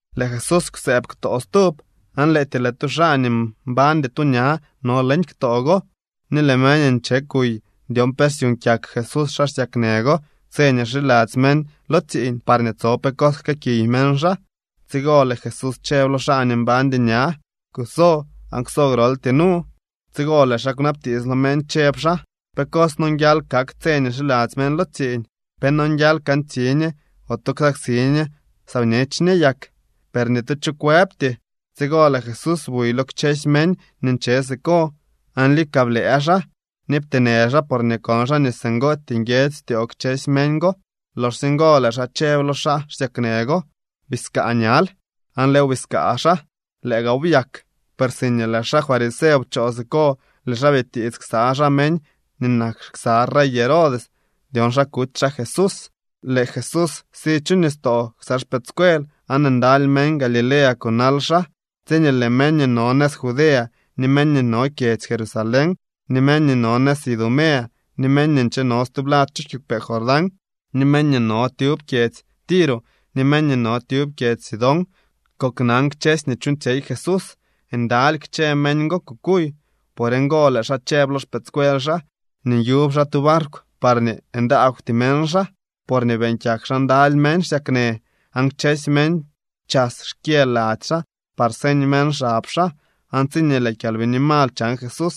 Lëë Jesús kwsëëb ktoo stub. Aan lëëtyee lëë tu xaa nii mbañdy tu ña no leñ ktoo go. Ni lëë meñ nche kuy dyon pe syuuñ kyak Jesús xaa xsyaknë go tse nii xiladzy meñ lo tsiiñ parñee tso pe cos jkëëkiy meñ xaa. Tsigo lëë Jesús chëb lo xaa nii mbañdy ña: —Kuso aan kwso groltyee nu. Tsigo lëë xaa kwnabtiits lo meñ chëb xaa: —¿Pe cos nonguial kak tse nii xiladzy meñ lo tsiiñ? ¿Pe nonguial kantsi ñe ote ksaksi ñe saa bñech ñe yak? Per ni tu cho kwëbty. Tsigo lëë Jesús buy lo kchësy meñ nii nche siko aan lika blëë xaa, ni pteenë xaa porñee kon xaa nii singootyee nguiedzy styoo kchësy meñ go. Loxsye ngo lëë xaa chëb lo xaa xsyaknë go: —Biskaa ñal. Aan lëëw biskaa xaa. Lëë gaaw byak. Per siñee lëë xaa fariseo pchoo siko lëë xaa bitiits ksa xaa meñ nii nak ksa rey Herodes dyon xa kuty xaa Jesús. Lëë Jesús si chu nistoo ksa xpëëdscuel aan ndaly meñ Galilea kunal xaa. Tsiñee lëë meñ nii no nëz Judea ni meñ nii no kyedzy Jerusalén ni meñ nii no nëz Idumea ni meñ nii ncheno stublad chu kiigwpee Jordán ni meñ nii no tyub kyedzy Tiro ni meñ nii no tyub kyedzy Sidón koknan kchësy nii chuuñtsyey Jesús, ndaly kchë meñ go kukuy. Por ngo lëë xaa chëb lo xpëëdscuel xaa nii nyub xaa tu barkw parñee ndaagwty meñ xaa. Porñee beeñ kyak xaa ndaly meñ xsyaknë, aan kchësy meñ chas xkyë lady xaa par señ meñ xab xaa. Aan tsiñee lëë kyalbini mal chan Jesús,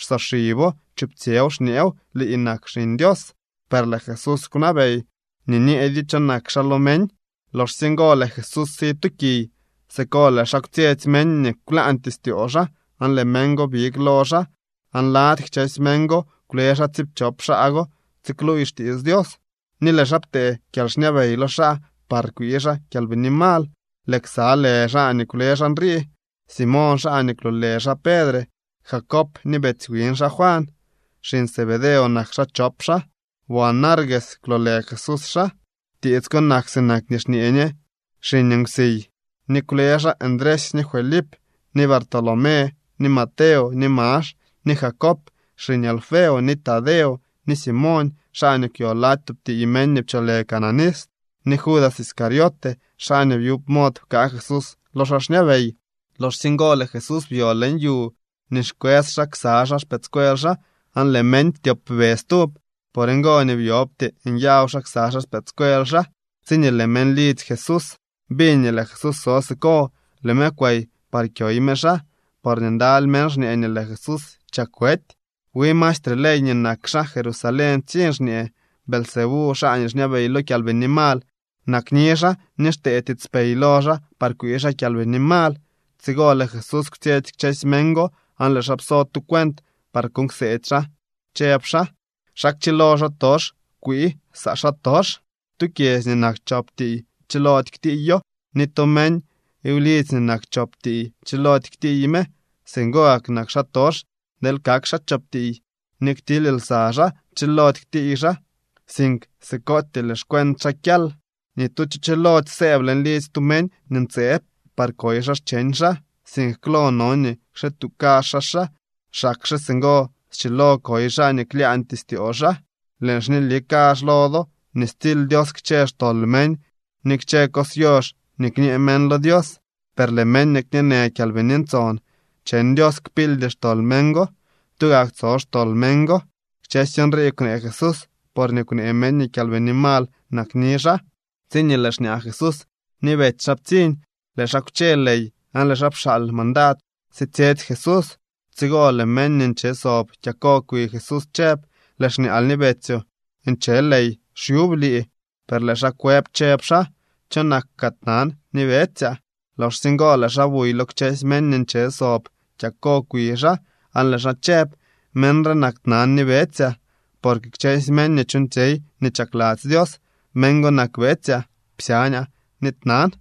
xsoxibo chuptsyëw xñeew: —¡Lii nak Xiñ Dios! Per lëë Jesús kwnabey nii nyeedyo cho nak xaa lo meñ. Loxsye ngo lëë Jesús si tu kiy. Siko lëë xaa kwtsyetsy meñ nii kwlaañtyee styoo xaa aan lëë meñ go big lo xaa. Aan lady kchësy meñ go kwle xaa tsiipchop xaa go tsikluuy xtiits Dios. Ni lëë xaa ptee kyalxñabey lo xaa par kwii xaa kyalbini mal. Lëë ksa lë xaa nii kwle xaa nrii: Simoñ, xaa nii kwloolë xaa Pedre, Jacob ni betsy wiñ xaa Juan. Xiñ Zebedeo nak xaa chop xaa. Boanerges kwloolë Jesús xaa. (Tiits ko nak sinak nii xñee ñe Xiñ Nkwsiy.) Ni kwle xaa Ndresy ni Felip ni Bartolomé ni Mateo ni Max ni Jacob xiñ Alfeo, ni Tadeo ni Simoñ, xaa nii kwyo lady tub tiiy meñ nii pcholë Cananista, ni Judas Iscariote, xaa nii byub mod pkaa Jesús lo xaa xñabey. Loxsye ngo lëë Jesús byo leñ yu nii xkwës xaa ksa xpëëdscuel xaa aan lëë meñ ptyopbe stub. Por ngo nii byobty nyaw xaa ksa xpëëdscuel xaa. Tsiñee lëë meñ lidzy Jesús biñ nii lëë Jesús so siko, lëë me kwey par kyoy me xaa, porñee ndaly meñ xñee nii lëë Jesús chak wety. Wi maestre ley nii nak xaa Jerusalén ptsiñ xñee: —Beelzebú, xaa nii xñabey lo kyalbini mal, nakni xaa ni xtee tiitspey lo xaa par kwii xaa kyalbini mal. Tsigo lëë Jesús kwtsyetsy kchësy meñ go aan lëë xaa pso tu cuent par kuuñ kseedy xaa chëb xaa: —¿Xa kchilo xaatox kwii saa xaatox? Tu kyedzy nii nak chop tiiy chilody ktiiyo. Ni tu meñ wlidzy nii nak chop tiiy chilody ktiiy me. Singo gak nak xaatox deel kak xaa chop tiiy ni ktily lsa xaa. Chilody ktiiy xaa, sink sikootyee lëë xcuent xaa kyal. ’Ni tu cho chilody sëëb leñ lidzy tu meñ nii ntseeb par koy xaa xcheñ xaa, sink klo no nii kxituu kazh xaa xaa. Xakxe singo schilo koy xaa nii klyaañtyee styoo xaa. ’Lëën xñeli kazh lo do nii stsily Dios kchë xtol meñ ni kchë cos yox nii kñee meñ lo Dios. Per lëë meñ nii kñeenë Kyalbini Ntson cheñ Dios kpildy xtol meñ go. Tugak tso xtol meñ go. Kchësy nrii kwnee Jesús porñee kwnee meñ nii kyalbini mal nakni xaa. Tsiñee lëë xñaa Jesús ni betsy xaa ptsiñ, lëë xaa kwche ley aan lëë xaa pxaal mandad sitsyetsy Jesús. Tsigo lëë meñ nii nche sob kyako kwi Jesús chëb: —Lëë xñaal ni betsyoo nche ley xyub lii. Per lëë xaa kwëb chëb xaa: —¿Cho nak kaa tnan ni betsyaa? Loxsye ngo lëë xaa buy lo kchësy meñ nii nche sob kyako kwi xaa aan lëë xaa chëb: —Meñ re nak tnan ni betsyaa. Porque kchësy meñ nii chuuñtsyey nii chakladzy Dios, meñ go nak betsyaa, psyañaa ni tnan.